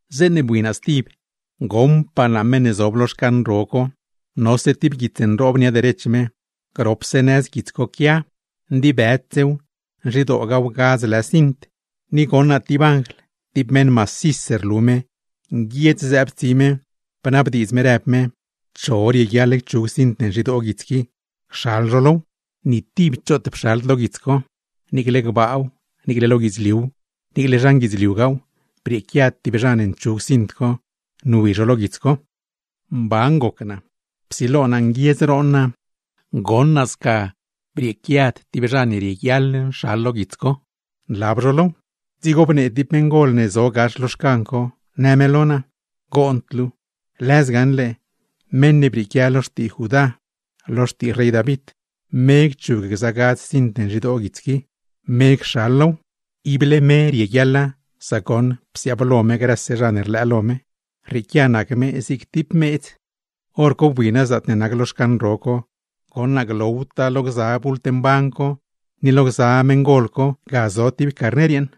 Zeeṉe bui naa stib, goṉpaa naa meṉ ne zob lo xcan ro co, nose tib guits nroob nia derech me. Gropse nëz guits co quia, ndibëdsew, nzhidoogaw gadz lë cint. Ni goṉ naa tib anjl, tib meṉ macis rlu me, nguiedz zëëb tsi me, bnabdiidz me rëb me: ―¿Cho rieguiaḻ cchug cint ne nzhidoo guits qui, cxal zho low? Ni tib choot pxald lo guits co, niicle gbaaw niicle lo guidzliuw, niicle zhan guidzliugaaw, brieequiad tib zha ne nchug cint co, nwi zho lo guits co. Mban goc naa, psilo naa nguiedz roon naa, goṉ naa sca brieequiad tib zha ne rieguiaḻ nxal lo guits co, nlab zho low. Dzigo bnee tib meṉgol ne zo gax lo xcan co, në me lo naa: ―Goond luu. Lëz gaṉle, meṉ ne brieequia lo xtii Judá, lo xtii rey David, me cchug gza gadz cint ne nzhidoo guits qui, me cxal low. Ible me rieguiaḻa, sac goṉ psiaablo me grëse zha ne rlëë lo me; rrieequia nac me zig tib meedz. Horco bui naa zaatne nac lo xcan ro co, goṉ naa glowtaa lo gza bult mban co ni lo gza meṉgol co, ga zo tib Carner yeeṉ.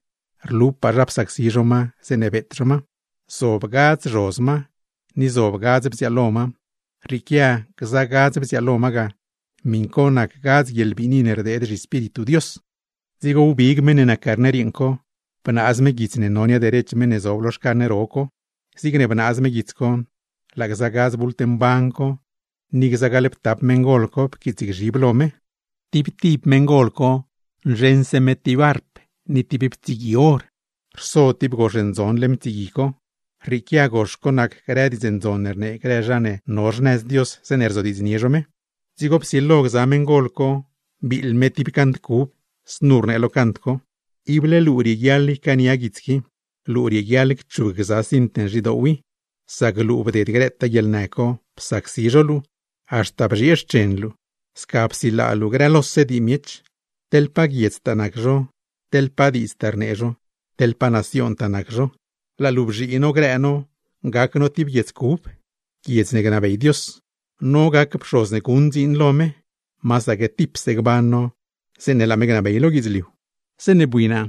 Rlupaa zha psacsi zho ma, zeeṉe beet zho ma. Zob gadz zhoz ma, ni zob gadz bziaalo ma, rrieequia gza gadz bziaalo ma ga, miṉ co nac gadz guieḻbiini ne rdeed zhiEspíritu Dios. Dzigo wbig meṉ ne nac Carner yeeṉ co, bnaaz me guits ne no nia derech meṉ ne zob lo xcan ro co. Zigne bnaaz me guits co, laa gza bult mban co, ni gza gaḻptap meṉgol co pquiitsgzhib lo me. Tib tib meṉgol co nzheṉse me tib arp ni tib ptsigui or, rso tib gox ndzon leṉ ptsigui co (rrieequia gox co nac grë diidz ndzon ne rnee grë zha ne no xnëz Dios zeeṉe rzodiidznie zho me). Dzigo psilo gza meṉgol co biiḻ me tib cant cub. Znu rnee lo cant co: ¡Ible luu rieguiaḻ ycaania guits qui, luu rieguiaḻ cchug gza cint ne nzhidoow i! Sac luu bded grëtaa guieḻnë co psacsi zho luu, haxta bzhiee xchen luu; sca psilaa luu grëlose dii miech, teḻ pa guiedztaa nac zho, teḻ pa diidztaa rnee zho, teḻ pa naciontaa ngab zho. Laa luu bzhii no grë no gac no tib guiedz cub, guiedz ne gnabey Dios; no gac pxoz ne guṉ dziin lo me, masaque tipse gban no zeeṉe gnabey me lo guidzliu. Zeeṉe bui naa,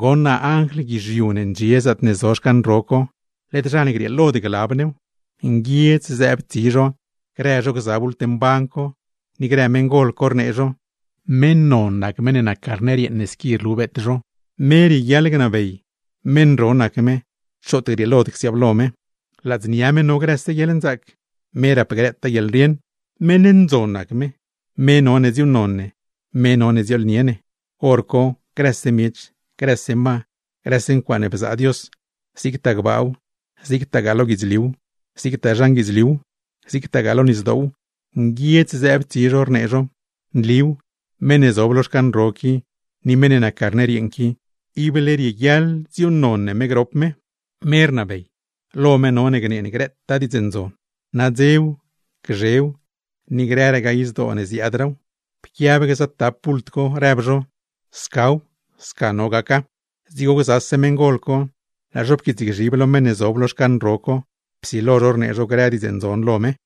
goṉ naa anjl guizhiu ne ndxie zaatne zo xcan ro co, led zha ne grieelod glab new. Nguiedz zëëb tsi zho grë zho gza bult mban co, ni grë meṉgol co, rnee zho: ¡Meṉ non nac meṉ ne nac Carner yeeṉ ne squi rlu beet zho! Me rieguiaḻ gnabey, meṉ ro nac me, choot grieelod csiaablo me. Ladznia me no grëse guieḻnzaac, me rap grëtaa guieḻrieṉ, Meṉ ndzon nac me, me none dziuuṉnon ne, me none dziooḻnie ne. Horco grëse miech, grëse ma, grëse ncuaaṉe bzaa Dios, zigtaa gbaaw, zigtagaa lo guidzliuw; zigtaa zhan guidzliuw, zigtagaa lo nisdoow; nguiedz zëëb tsi zho, rnee zho: ¡Nliw, meṉ ne zob lo xcan ro qui, ni meṉ ne nac Carner yeeṉ qui, ible rieguiaḻ dziuuṉnon ne grop me! ¡Me rnabey, lo me none gnee ne grëtaa diidz ndzon; nadzew, gzhew, ni grëragaa izdoo ne ziaadraaw! Pquiab gza tap bult co, rëb zho: ―¡Scaw, sca no gaca! Dzigo gzase meṉgol co, laa zho pquiitsgzhib lo meṉ ne zob lo xcan ro co; psilo zho rnee zho grë diidz ndzon lo me.